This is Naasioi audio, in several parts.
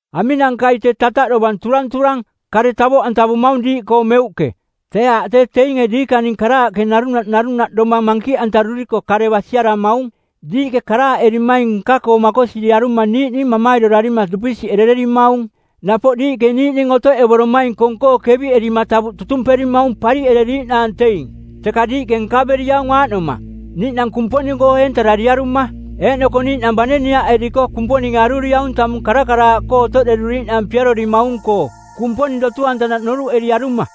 Aminankai tee tataꞌ dovang turanturang, kare tavoꞌantavumaung diiꞌkoo meuꞌke? Tee aaꞌ tee teinge diikaning karaaꞌke narunaꞌ narunaꞌ domang mankiꞌantaruriko kare basiaramaung. Diiꞌke karaaꞌerimaing nka-koo makosiriaruma niiꞌning mamairorarima dupisiꞌerererimaung. Napoꞌ diiꞌke niiꞌning otoꞌevoromaing kong-koo keviꞌerima tavuꞌ tutumperimaung pariꞌereriiꞌnaang teing. Teka diiꞌke nkaveriaung aaꞌnoma: niiꞌnang Kumponing-koo eentarariaruma. Eeꞌnoko niiꞌnang bane niaꞌeriko Kumponinge aruriaung tamung karakaraaꞌkoo otoꞌderuriiꞌnaang piarorimaung-koo, Kumponing dotu-antanaꞌ noruꞌeriaruma.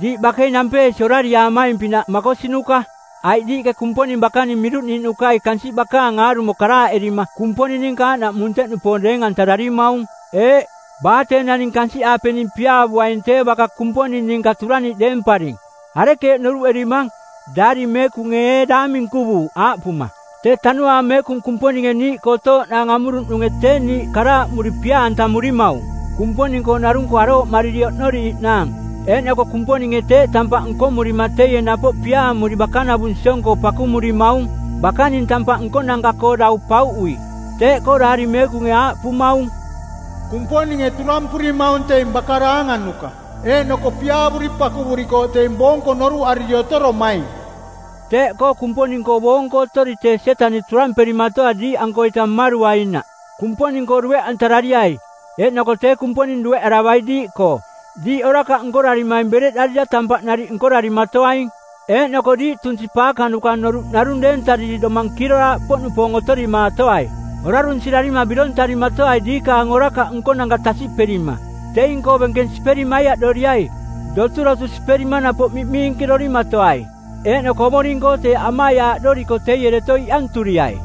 Diiꞌ bakei nampeesi orariaamaing-pinaꞌ makosinuka, aiꞌ diiꞌke Kumponing bakaning miruꞌniiꞌnukai kansiꞌ bakaang aarumo karaaꞌerima Kumponing ninka aaꞌnaꞌ munteꞌnupoong deeng-antararimaung. Eeꞌ, baa tee naning kansiꞌaapening piaavuaing tee baka Kumponing ninka turaniꞌ deemparing. Arekeeꞌ noruꞌerimang? Daari Meekunge ee daang minkuvuuꞌ aaꞌpuma, “Tee Tanuaang Meekung Kumponinge niiꞌkoo otooꞌnaang amuruꞌnunge tee niiꞌ karaaꞌmuri pia-antamurimaung Kumponing-koo narung-koo arooꞌmariri oꞌnoriiꞌnaang.”? Eeꞌnoko Kumponinge teeꞌ tampaꞌ nkomurima teie napoꞌ piaamuri bakanavung siong-koo pakumurimaung bakaning tampaꞌ nkonanka-koo dau pauꞌui. Teeꞌkoo Daari Meekunge aaꞌpumaung, “Kumponinge turampurimaung teing baka daanganuka, eeꞌnoko piaavuri pakuvurikooꞌ teing boonko noruꞌariri otoromaing.” Teeꞌkoo Kumponing-koo boonko otori tee Sietaniꞌ turamperimatoai diiꞌankoita mmaruainaꞌ. Kumponing-koo dueꞌantarariai eeꞌnoko tee Kumponing dueꞌaravai diiꞌkoo. Diiꞌ orakaꞌ nkorarimaing bereꞌdarira tampaꞌ nariꞌ nkorarimatoaing, eeꞌnoko diiꞌ tunsi paakanuka noruꞌ narung deentariri domang kiiroraaꞌpoꞌnupoong otorimaatoai. Orarunsirarima birontarimatoai diikaang orakaꞌ nkonanka tasiꞌperima. Teing-koo benkeng siperi maiaꞌdoriai. Doturotu siperima napoꞌ miꞌmiinkirorimatoai. Eeꞌnoko Ovoring-koo teeꞌ amaiaaꞌdoriko teie deto iꞌanturiai.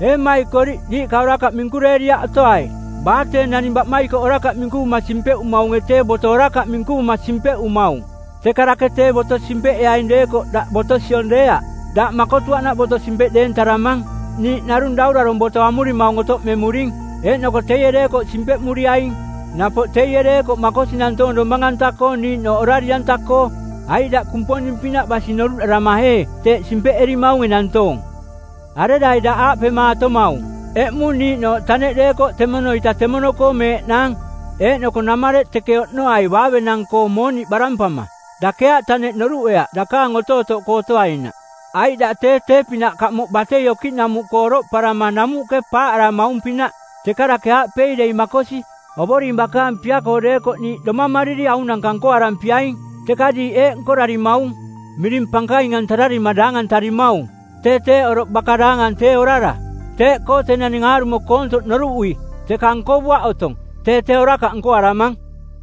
Ee mmaikoriꞌ, diiꞌka orakaꞌ minkureeriaꞌ otoai. Baa tee naning baꞌmaikoꞌ orakaꞌ minkuvuma simpeꞌumaunge tee boto orakaꞌ minkuvuma simpeꞌumaung. Teka dake tee boto simpeꞌeaing deekoꞌ daꞌ boto siong deeaꞌ, daꞌ makotuaꞌnaꞌ boto simpeꞌ deeng-antararamang. Niiꞌ narung daurarong˜ boto amurimaung otoꞌmemuring, eeꞌnoko teie deekoꞌ simpeꞌmuriaing. Napoꞌ teie deekoꞌ makosi nantoong domang-anta-koo niiꞌnooꞌ orari-anta-koo. Aiꞌ daꞌ Kumponing-pinaꞌ basi noruꞌdarama ee teeꞌ simpeꞌerimaunge nantoong? Arerai daꞌ aaꞌpemaatomaung, “Eꞌmung niiꞌnooꞌ taneꞌ deekoꞌ temono-ita temono-koo meeꞌnaang eeꞌnoko namareꞌ teke oꞌnoai baavenang-koo mooniꞌ barampama.” Dake aaꞌ taneꞌ noruꞌeaꞌ dakaang otootoꞌkoo otoainaꞌ, aiꞌ daꞌ tee tee-pinaꞌ kamoꞌ batei okiꞌnamuꞌkoo oroꞌparama namuꞌke paaꞌaramaung-pinaꞌ. Teka dake aaꞌpei dei makosi, “Ovoring bakaang pia-koo deekoꞌ niiꞌ domamariri aunanka nkoarampiaing.” Teka diiꞌ eeꞌ nkorarimaung, miring pankaintarima daangantarimaung. Tee teeꞌ oroꞌ baka daangang tee orara. Teeꞌkoo tee naning aarumo koontoꞌ noruꞌui, teka nkovuaꞌ otong, tee tee orakaꞌ nkoaramang.